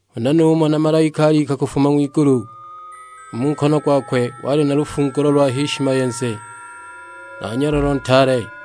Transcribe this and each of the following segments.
Huna numona malaika alika kufuma ng'wigulu; u mu nkono gwakwe wali na lufungulo lwa h'ishimayenze na nyololo ntaale.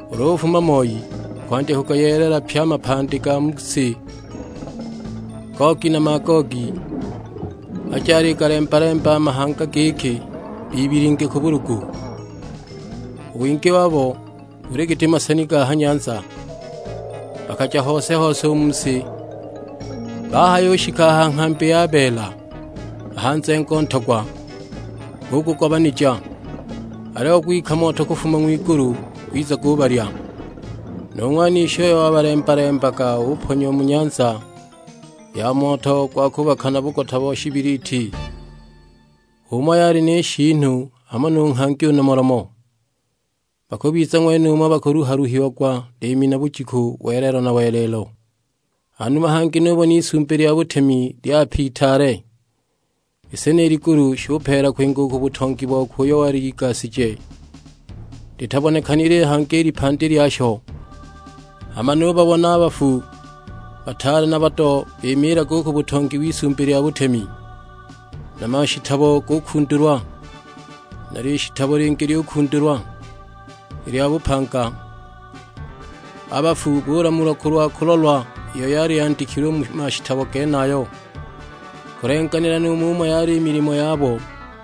Ulu ufuma moi akwandya kugayeelela pye a mapandi ga mu si, Gogi na Magogi; aje aligalemba-lemba a mahanga giki bibilinge ku bulugu. U wingi wabo buli giti maseni ga ha nyanza. Bakaja hose-hose u mu si, bahayushika ha nghambi ya beela, a ha nzengo ntogwa, bugugobanija; aliyo gwika moto kufuma ng'wigulu gwiza gubalya. Nu ng'wanishi uyo wabalemba-lembaga uponyiwa mu nyanza ya moto gwa kubaka na bugota bo shibiliti; h'umo yali ni shiinu hamo nu nghangi u nomolomo. Bakubiza ng'wenumo bakuluha-luhiagwa liimi na bujiku welelo na welelo. Hanuma hangi nubona Isumbi lya butemi lyape itaale; i si ni ligulu shupeela kwinga u ku butongi bokwe uyo wali aligasigije, litabonekanile hangi i lipandi lyasho. Hama nubabona a bafu, bataale na bado bimiilaga u ku butongi w'Isumbi lya butemi, na mashitabo gukundulwa; na lishitabo lingi lyukundulwa, i lya bupanga. A bafu buulamulwa kulwa kulolwa iyo yali yandikilwe u mu mashitabo genayo, kulenganila nu mumo yali i milimo yabo.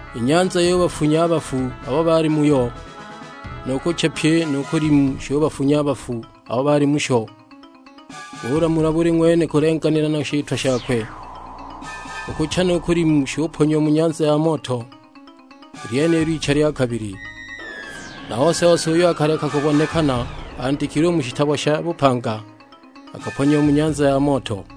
I nyanza yubafunya a bafu abo baali muyo, nu kucha pyi nu kulimu shubafunya a bafu abo baali musho. Buulamulwa buli ng'wene kulenganila na shitwa shakwe! U kucha nu kulimu shuponyiwa mu nyanza ya moto; i lyenilo icha lya kabili. Na ose-ose uyo akaleka kubonekana andikilwe u mu shitabo sha bupanga akaponyiwa mu nyanza ya moto!